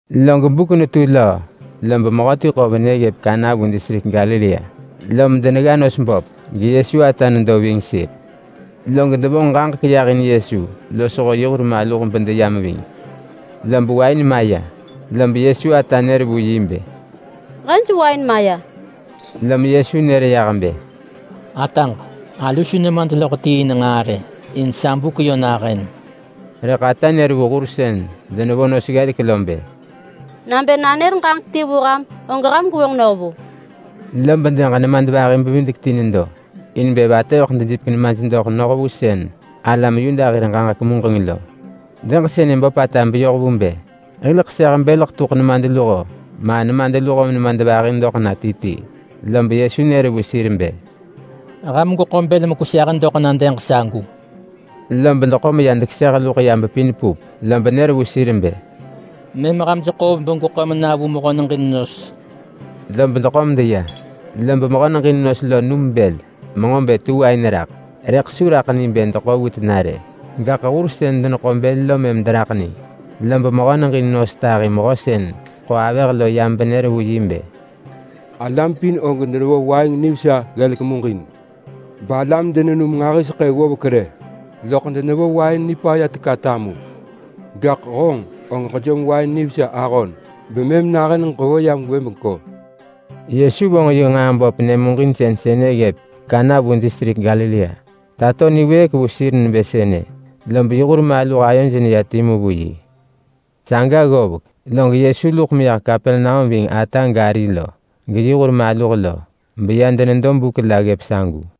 Log buk netu löö lob mehöti ḳo venë ggëp Kana vu distrik Galilea, lom denegga nos böp geYesu ata nedo ving sir. Log devonġ ġaġek yah in Yesu losho yi hurmaluh bedeyam ving. Lob wain maya, lob Yesu ata nër vu yi bë, “Hej wain maya!” Lom Yesu nër yah bë, “Ataġ! Alu su nemad loḳ ti in nġaa rë! In sa buk yö nahën!” Rëḳ ata nër vu hur sën denevo nos ggelek lo bë, “Nabë nanër ġaġek ti vu ham, og ham gwevonġ noh vu!” Lob dëg nemadvahi-bevidek-ti nedo in bë vatëveḳ dejipek nemaj doḳ noh vu sën alam Yuda hir ġaġek muġeng lo. Dëg sënë böpata beyoh vu bë hil ḳeseh bël ḳetuḳ nemadluho ma nemadluho-menemadvahi doḳ na ti ti. Lob Yesu nër vu sir bë, “Ham gweḳo bël mekweseh doḳ na dëg sagu!” Lob deḳo meya dekeseh luḳ ya bepin pup. Lob nër vu sir bë, “Mëm ham jeḳoov begweḳo mena vu mehö-neġin-nos!” Lob deḳo medeya. Lob mehö-neġin-nos lo num bël menġo bë tu wain raḳ, rëḳ su raḳ ni bë deḳo vu tena rë. Gaḳ hur sën deneḳo bël lo mëm deraḳ ni. Lob mehö-neġin-nos tahi mehö sën ḳo avëh lo yam benër vu yi bë, “Alam pin og denevo wain nivesa ggelek muġin, balam denenum nġahiseḳë ggovek rë, loḳ denevo wain nipaya teka tamu. Gaḳ honġ og ġejom wain nivesa ahon bemëm nahën ġevo yam gwëbengko!” Yesu vonġ yi nġaa böp nyëmuġinsën sënë ggëp Kana vu distrik Galilea. Tato niwëëk vu sir nebë sënë, lob yi hur maluh ayoj neya timu vu yi. Saga ggovek log Yesu luḳ meyah Kapernaum ving ata gari lo, geyi hur maluh lo. Beya denedo buk la ggëp sagu.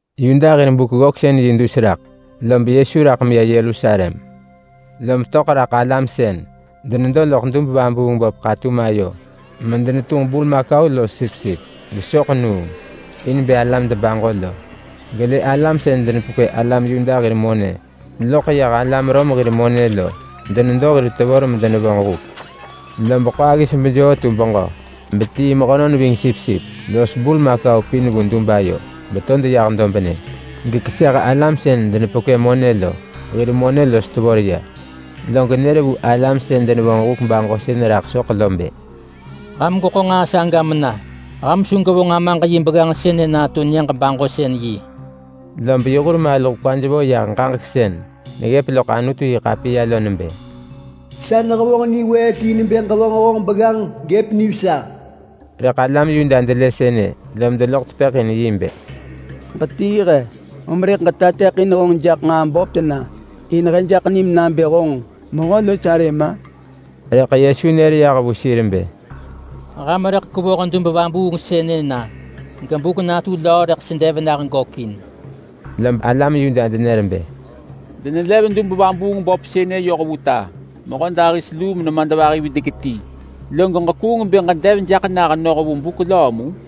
Yuda hir Buk-ggöksën-yi dus raḳ, lob Yesu raḳ meya Yerusalem. Lom töḳ raḳ alam sën denedo loḳ dub-vabuung-böp ḳatum ayo medenetunġ burmakau los sipsip gesoḳ nuung in bë alam debaġo lo. Gelë alam sën denepekwë alam Yuda hir monë loḳ yah alam Rom hir monë lo denedo hir tevor medenevonġ huk. Lob ḳo aggis bejoo tu beġö betii mehönon ving sipsip los burmakau pin vu dub ayo beto deyah dobnë. Gekeseh alam sën denepekwë monë lo, hir monë los tevor ya. Log nër vu alam sën denevonġ huk baġosën raḳ soḳ lo bë, “Ham gweḳo nġaa saga mena! Ham su gwevonġ Amaġ yi begganġ sënë natu nyëġ-baġosën-yi.” Lob yi hur maluh kwaj vo yah ġaġek sën neggëp loḳ Anutu-yi-ḳapiya lo nebë: “Sa nehevonġ niwëëk in bë ġevonġ honġ begganġ gëp nivesa.” Rëḳ alam Yuda delë sënë lom deloḳ tepëḳ in yi bë, “Ġetii he, om rëḳ ġetateḳin honġ jaḳ nġaa böp tena in he jaḳ nim nabë honġ mehö-los-arëm-a?” Rëḳ Yesu nër yah vu sir bë, “Ham rëḳ kwevoh dub vabuung sënë na, gebuk natu löö rëḳ sedev nah gökin!” Lob alam Yuda denër bë, “Denelev dub-vabuung-böp sënë yoh vu ta mehödahis luu menenadvahi-videk-ti, log ġekuung bë ġedev jaḳ nah noh vu buk löö mu?”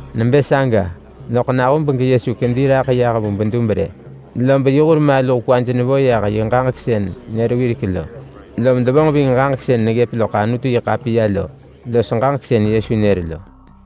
Nebë saga, loḳ nahub geYesu kedi raḳ yah vu bedub rë, lob yi hur maluh kwaj nevo yah yi ġaġek sën nër wirek lo, lom devonġ ving ġaġek sën neggëp loḳ Anutu-yi-ḳapiya lo los ġaġek sën Yesu nër lo.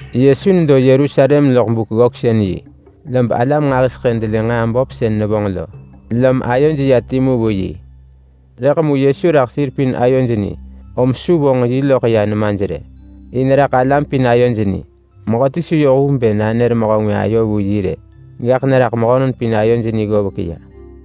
Yesu nedo Yerusalem loḳ Buk-ggöksën-yi, lob alam nġahiseḳë delë nġaa böp sën nevonġ lo, lom ayoj ya timu vu yi. Rëḳ mu Yesu raḳ sir pin ayoj ni om su vonġ yi loḳ ya nemaj rë. In raḳ alam pin ayoj ni. Mehöti su yoh vu bë nanër mehö ngwë ayo vu yi rë, gaḳ neraḳ mehönon pin ayoj ni ggovek ya.